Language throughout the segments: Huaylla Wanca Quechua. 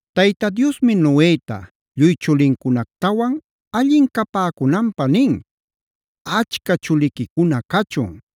Tayta Diosmi Noeta, lluy chulincunactawan allin capäcunanpä nin: “Achca chuliquicuna cachun;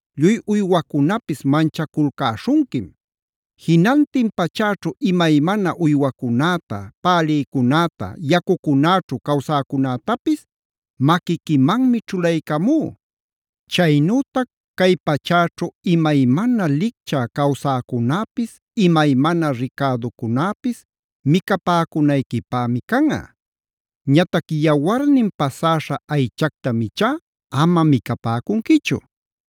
Lluy uywacunapis manchaculcäśhunquim. Jinantin pachäćhu imaymana uywacunäta, pälïcunäta, yacucunäćhu cawsäcunätapis maquiquimanmi ćhulaycamú. Chaynütac cay pachäćhu imaymana licchä cawsäcunäpis, imaymana ricäducunäpis micapäcunayquipämi canꞌa. Ñatac yawarnin pasäśha aychactam ichá ama micapäcunquichu;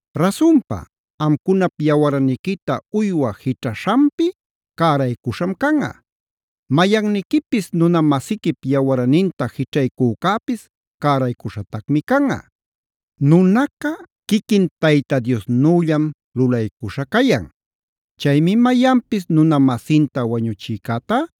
Rasunpa, amcunap yawarniquita uywa jićhaśhanpi cäraycuśham canꞌa. Mayanniquipis nuna-masiquip yawarninta jićhaycücäpis cäraycuśhatacmi canꞌa. “Nunaca quiquin Tayta Diosnüllam lulaycuśha cayan.c Chaymi mayanpis nuna-masinta wañuchïcätá,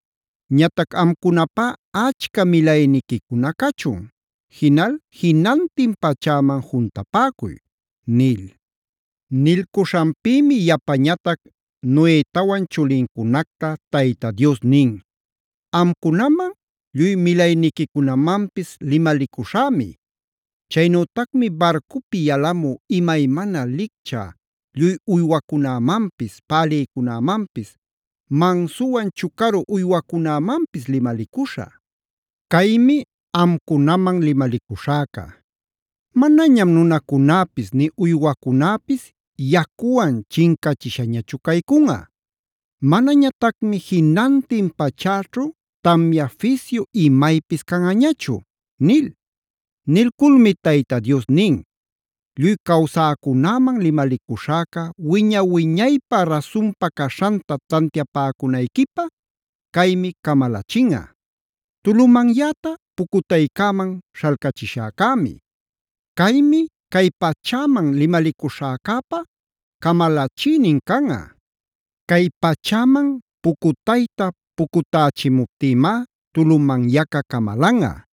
Ñatac amcunapá achca milayniquicuna cachun. Jinal jinantin pachäman juntapäcuy” nil. Nilcuśhanpïmi yapañatac Noetawan chulincunacta Tayta Dios nin: “Amcunaman, lluy milayniquicunamanpis limalicuśhämi. Chaynütacmi barcupi yalamü imaymana lichcä lluy uywacunämanpis: pälïcunämanpis, mansuwan chucaru uywacunämanpis limalicuśhä. Caymi amcunaman limalicuśhäca: Manañam nunacunäpis nï uywacunäpis yacuwan chincachishañachu caycunꞌa. Manañatacmi jinantin pachäćhu tamya fisyu imaypis canꞌañachu” nil. Nilculmi Tayta Dios nin: “Lluy cawsäcunäman limalicuśhäca wiña-wiñaypä rasunpa caśhanta tantiapäcunayquipä caymi camalachinꞌa: Tulumanyäta pucutaycäman śhalcachishäcämi. Caymi cay pachäman limalicuśhäcäpa camalachïnin canꞌa. Cay pachäman pucutayta pucutächimuptïmá tulumanyaca camalanꞌa.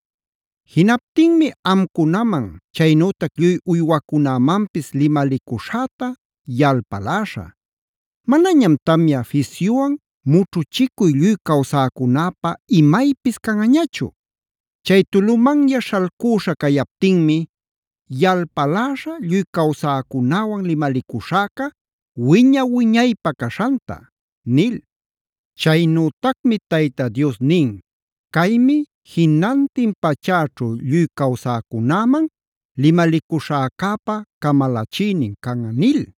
Jinaptinmi amcunaman, chaynütac lluy uywacunämanpis limalicuśhäta yalpaläśhä. Manañam tamya fisyuwan mućhuchicuy lluy cawsäcunäpä imaypis canꞌañachu. Chay tulumanya śhalcüśha cayaptinmi yalpaläśhä lluy cawsäcunäwan limalicuśhäca wiña-wiñaypä caśhanta” nil. Chaynütacmi Tayta Dios nin: “Caymi jinantin pachäćhu lluy cawsäcunäman limalicuśhäcäpa camalachïnin canꞌa” nil.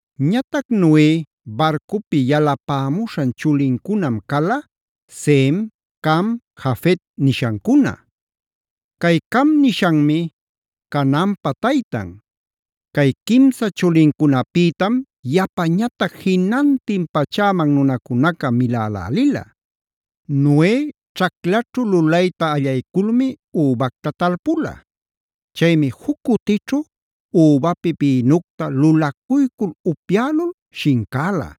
Ñatac Noe barcupi yalapämuśhan chulincunam cala: Sem, Cam, Jafet nishancuna. Cay Cam nishanmi Canaanpa taytan. Cay quimsa chulincunapïtam yapañatac jinantin pachäman nunacunaca milälälila. Noe ćhaclaćhu lulayta allayculmi übacta talpula. Chaymi juc cutićhu übapi bïnucta lulacuycul upyälul shincäla.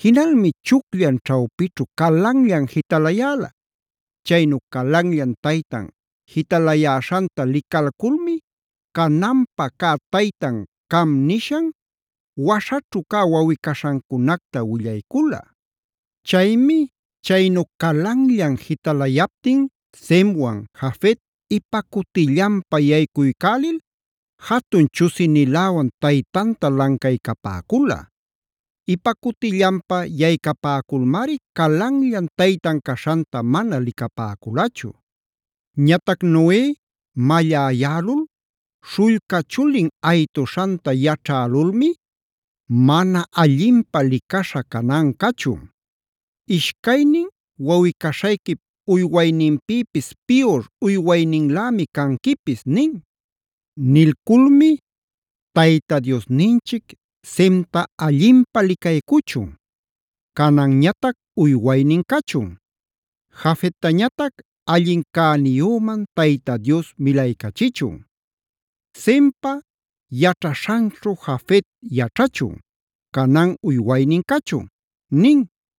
Jinalmi chucllan ćhawpićhu calanllan jitalayäla. Chaynu calanllan taytan jitalayäśhanta licalculmi, Canaanpa cä taytan Cam nishan waśhaćhu cä wawꞌi-caśhancunacta willaycula. Chaymi chaynu calanllan jitalayaptin Semwan, Jafet ipa cutillanpa yaycuycälil jatun chusiniläwan taytanta lancaycapäcula. Ipa cutillanpa yaycapäculmari calanllan taytan caśhanta mana licapäculachu. Ñatac Noe malläyälul, śhullca chulin aytuśhanta yaćhälulmi: “¡Mana allinpä licaśha Canaan cachun! Ishcaynin wawꞌi-caśhayquip uywayninpïpis piyur uywayninlämi canquipis” nin. Nilculmi: “¡Tayta Diosninchic Semta allinpä licaycuchun! ¡Canaanñatac uywaynin cachun! ¡Jafettañatac allin cäniyüman Tayta Dios milaycachichun! ¡Sempa yaćhaśhanćhu Jafet yaćhachun; Canaane uywaynin cachun!” nin.